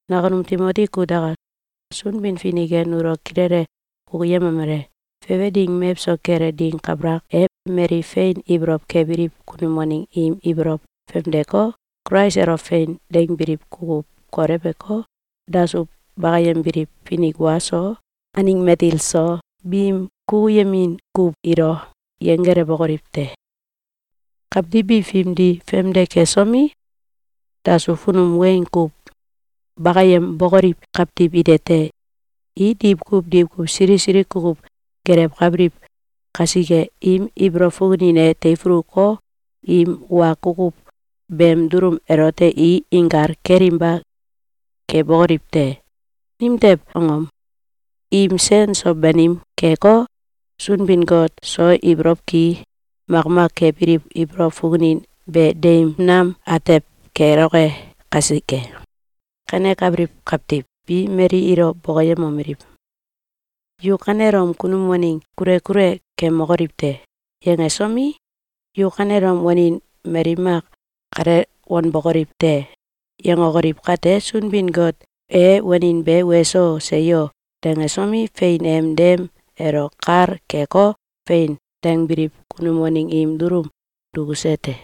Nakunum Timoti kutaka! Sunbin-Finik e nulo kilele kukuyemomele: Fefe ding mewso kele ding kabalak e, mali fein ibolow kebiliw kunum waneng i ibolow famdeko, Kulais elo “Fein!”, dangbiliw kukuw kolewko, dasuw bakayembiliw finik wa so, aneng matil so, biim kukuyemin kuw ilo yenggelewokoliw te. Kawtiw bi fimdi famde kesomi, dasuw funum weng kuw bakayembokoliw kawtiw ite te. I diwkuw diwkuw sili sili kukuw gelewkabiliw kasike, im ibolow fukunin e teifuluko, im wa kukuw beem dulum elote i inkal kelinba kebokoliw te. Nimtew angom? Im sen so banim keko, Sunbin-Got so ibolow ki makmak kebiliw ibolow fukunin be deim nam atew keloke kasike. Kanekabiliw kawtiw bi mali ilo bokoyemomeliw: “Yu kanelom kunum waneng kule kule kemokoliw te!”, yangesomi, “Yu kanelom wanin mali mak kale wanbokoliw te!”, yangokoliw kate, Sunbin-Got e wanin be “Weso! Seyo!”, dangesomi, fein em dem elo kal keko, “Fein!”, dangbiliw kunum waneng im dulum dukuse te.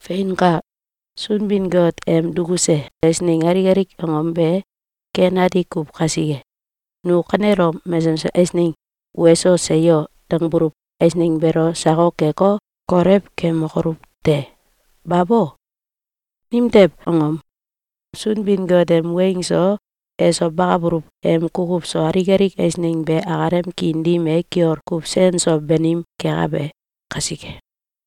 Feinka! Sunbin-Got em dukuse eisneng alik alik angom be ken ati kuw kasike, nu kanelom mesesem eisneng “Weso! Seyo!”, dangbuluw eisneng beelo sakok keko, kolew kemokoluw te! Babo! Nimtew angom? Sunbin-Got em weng so, eso bakabuluw em kukuw so, alik alik eisneng be akalem kiin dim e kiol kuw sen so banim kekabe kasike.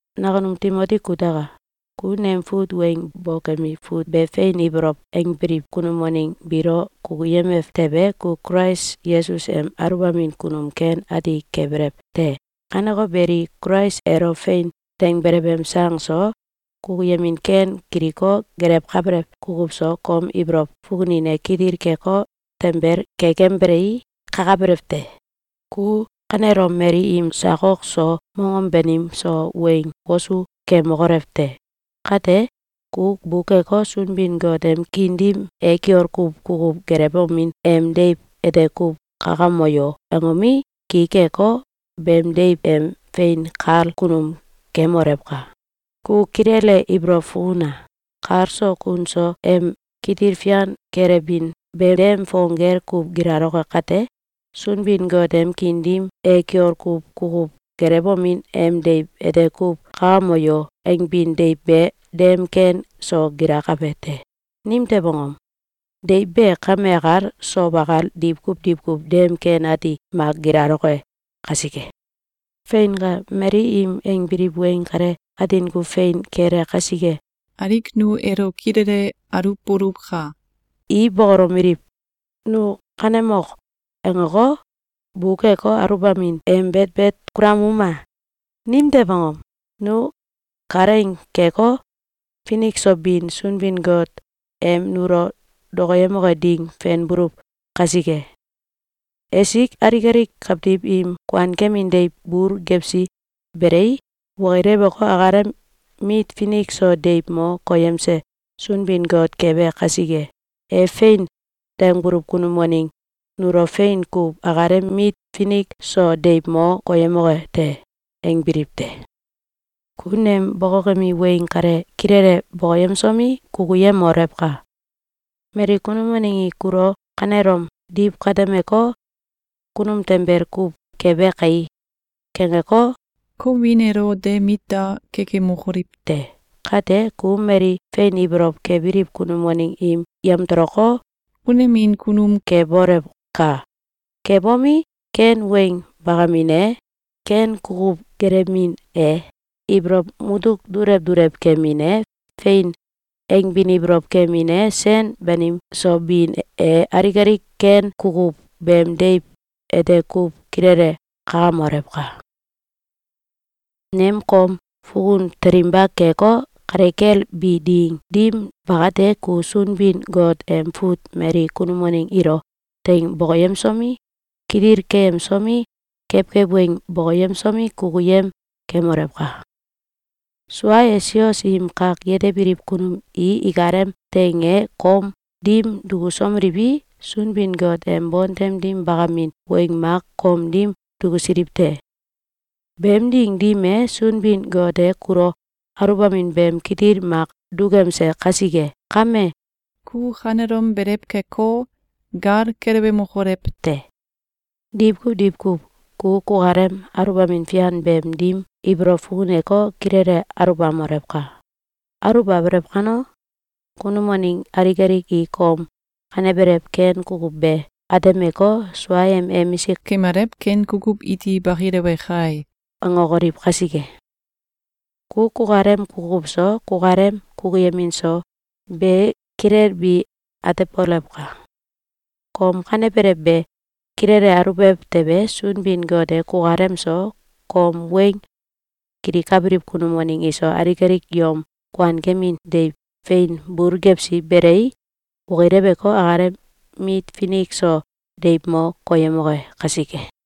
Nakunum Timoti kutaka! Ku nem fut weng bokemi fut be fein ibolow angbiliw kunum waneng biilo kukuyemew tewe, ku Kulais Yesus em aluwbamin kunum ken ati kebelew te. Kaneko beli, Kulais elo fein dangbelew em sang so, kukuyemin ken kiliko, gelewkabelew kukuw so, kom ibolow fukunin e kitil keko, tanbel kekembelei, kakabelew te. Ku kanelom mali im sakok so, mongom banim so, weng wosu kemokolew te! Kate, ku bukeko, “Sunbin-Got em kiin dim e kiol kuw kukuw gelewomin em deiw ete kuw kakamoyo!”, angomi, ki keko, beem deiw em fein kal kunum kemolewka! Ku kilele ibolow fukuna! Kal so kun so em kitil fian kelebin be dem fong gel kuw gilaloke kate, “Sunbin-Got em kiin dim e kiol kuw kukuw gelewomin em deiw ete kuw kakamoyo!”, angbin deiw be dem ken so gilakabe te. Nimtew angom? Deiw be kame akal, sow akal, diwkuw diwkuw dem ken ati mak gilaloke kasike. Feinka! Mali im angbiliw weng kale atin kuw fein kele kasike, alik nu elo kilele aluwboluwka! I bokolomeliw: “Nu ‘Kanemok!’, angeko, bukeko, aluwbamin em betbet kulamuma! Nimtew angom? Nu kalaing keko, finik so bin Sunbin-Got em nulo dokoyemoke ding fenbuluw kasike. Esik alik alik kawtiw im kuankemin deiw bul gewsi belei, okileweko, akalem mit finik so deiw mo koyemse Sunbin-Got kebe kasike, e ‘Fein!’, dangbuluw kunum waneng nulo fein kuw akalem mit finik so deiw mo koyemoke te.”, angbiliw te. Ku nem bokokemi weng kale kilele bokoyemsomi, kukuyemolewka! Mali kunum waneng i kulo kanelom diw katemeko, “Kunum tanbel kuw kebe kae!”, kangeko, kom wiin elo de mit da kekemokoliw te! Kate, ku mali fein ibolow kebiliw kunum waneng im yamtoloko, unemin kunum kebolewka! Kebomi, ken weng bakamin e, ken kukuw gelewmin e, ibolow mutuk dulew dulew kemin e, “Fein!”, angbin ibolow kemin e, sen banim so bin e, alik alik ken kukuw beem deiw ete kuw kilele kakamolewka! Nem kom fukun telinba keko, kale kel bi ding dim bakate, ku Sunbin-Got em fut mali kunum waneng ilo teing bokoyemsomi, kitil keyemsomi, kewkew weng bokoyemsomi, kukuyem kemolewka! Sua e, sios im kak yetebiliw kunum i ikalem teing e kom dim dukusomeliwi, Sunbin-Got em bontem dim bakamin weng mak kom dim dukusiliw te. Beem ding dim e, Sunbin-Got e kulo aluwbamin beem kitil mak dukemse kasike kame, ku kanelom belew keko, gal kelewemokolew te! Diwkuw diwkuw ku kukalem aluwbamin fian beem dim ibolow fukuneko, kilele aulbamolewka! Aluwbabelew kano, kunum waneng alik alik i kom kanebelew ken kukuw be atemeko, “Sua em emisik kemalew ken kukuw iti bakilewe kai!”, angokoliw kasike. Ku kukalem kukuw so, kukalem kukuyemin so, be kilelbi atebolewka! Kom kanebelew be kilele aluwbelew tewe, Sunbin-Got e kukalem so, kom weng kilikabiliw kunum waneng iso, alik alik yom kuankemin deiw fein bul gewsi belei, okileweko, akalem mit finik so deiw mo koyemoke kasike.